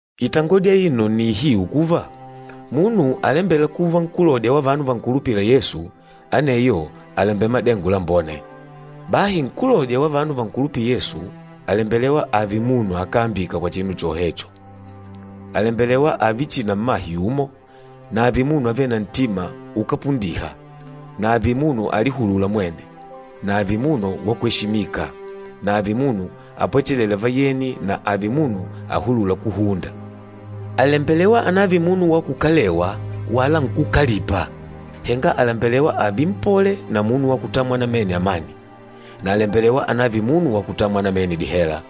Itangodi aino nni ihiu kuva, “Munu alembêla kuva nkúlodya wa vanu vankulupîla Yesu, aneyo àlembela madengo lambone.” Bahi nkúlodya wa vanu vankulupîla Yesu àlembelewa ààve munu akáambika kwa chinu chohecho. Àlembelewa ààve chihi na mmahe yumo, na ààve munu avêle na ntima ukápundiha na ààve munu alihulûla mwene, na ààve munu wakweshimika na ààve munu apwechelêla vayeni na ààve munu ahulûla kuhunda. Àlembelewa anààve munu wa kukalewa wala nkúkalipa, henga àlembelewa ààve mpole na munu wa kutamwa namene amani, na àlembelewa anààve munu wa kutamwa namene dihela.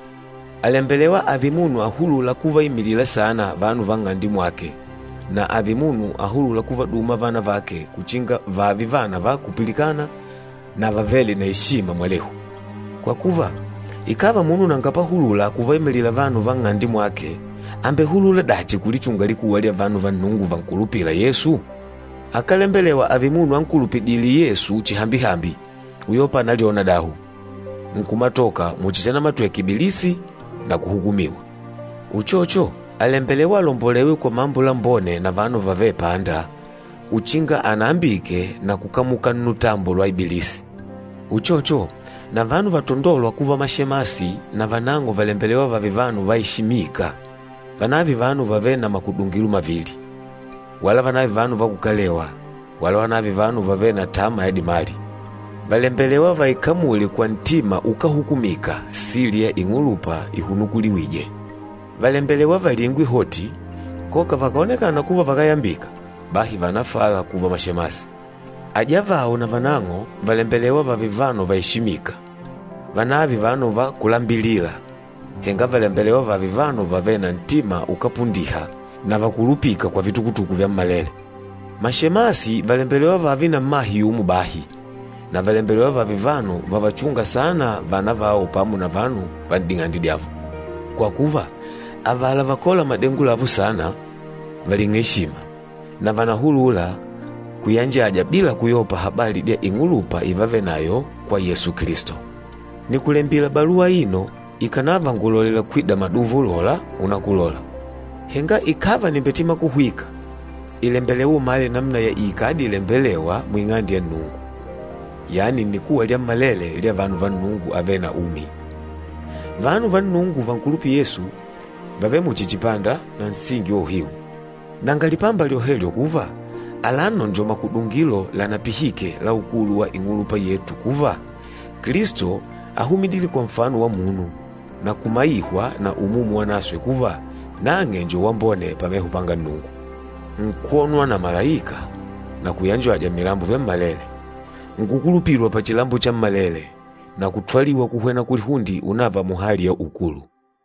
Àlembelewa ààve munu ahulûla kuvaimilila saana vanu va nng'ande mwake na ààve munu ahulûla kuvaduma vana vake uchinga vààve vana va kupilikana na vavêle na eshima mwalehu. Kwa kuva, ikàva munu nanga pahulula kuvaimilila vanu va nng'ande mwake, àmbehulula dachi kulichunga likuwa lya vanu va Nnungu vankulupîla Yesu? Akálembelewa ààve munu ankulupidîle Yesu chihambihambi, uyopa ànalyona dahu, nkumatoka muchi chanamatweke Ibilisi na kuhukumiwa. Uchocho, àlembelewa alombolewe kwa mambo lambone na vanu vavêle panda, uchinga anahebuliwe na kukamuka nnutambo lwa Ibilisi. Uchocho, na vanu vatondôlwa kuva mashemasi navanang'o vàlembelewa vààve vanu vaeshimika, vanààve vanu vavêle na makudungilo mavili, wala vanààve vanu va kukalewa, wala vanààve vanu vavêle na tama ya dimali. Vàlembelewa vaikamule kwa ntima ukáhukumika sili ya ing'ulupa ihunukuliwîje. Vàlembelewa valingwe hoti, koka vakàonekana kuva vakáyambika, bahi vànafala kuva mashemasi. Ajavao na vanang'o vàlembelewa vààve vanu vaeshimika, vanààve vanu va kulambilila, henga vàlembelewa vààve vanu vavêle na ntima ukápundiha na vakulupîka kwa vitukutuku vyammalele. Mashemasi vàlembelewa vààve na mmahe yumo bahi, na vàlembelewa vààve vanu vavachûnga saana vana vao pamo na vanu va n'ding'ande dyavo. Kwa kuva, avala vakôla madengo lavo saana, vàling'a eshima, na vànahulula kuyanjaja bila kuyopa habali dya ing'ulupa ivavenayo kwa Yesu Kilisto. Nìkulembila baluwa aino, ikànava ngùlolela kwida maduva ulola unakulola. Henga ikàva nìmbetima kuhwika, ìlembelewa umale namuna ya iikadi ilembelêwa muing'ande ya Nnungu, yani nnikuwa lyammalele lya vanu va Nnungu avêle na umi. Vanu va Nnungu vankulupîla Yesu vàvele muchi chipanda na nsingi wa uhiu. Nanga lipamba lyohelyo kuva, alano njo makudungilo lanapihike la ukulu wa ing'ulupa yetu kuva, Kilisto áhumidile kwa nfano wa munu, na kumaihwa na Umumu Wanaswe kuva nang'e njo wambone pameho panga Nnungu. Nkwonwa na malaika, na kuyanjajwa mmilambo vyammalele. Nkukulupilwa pachilambo chammalele, na kutwaliwa kuhwena kulihunde unàvà muhali ya ukulu.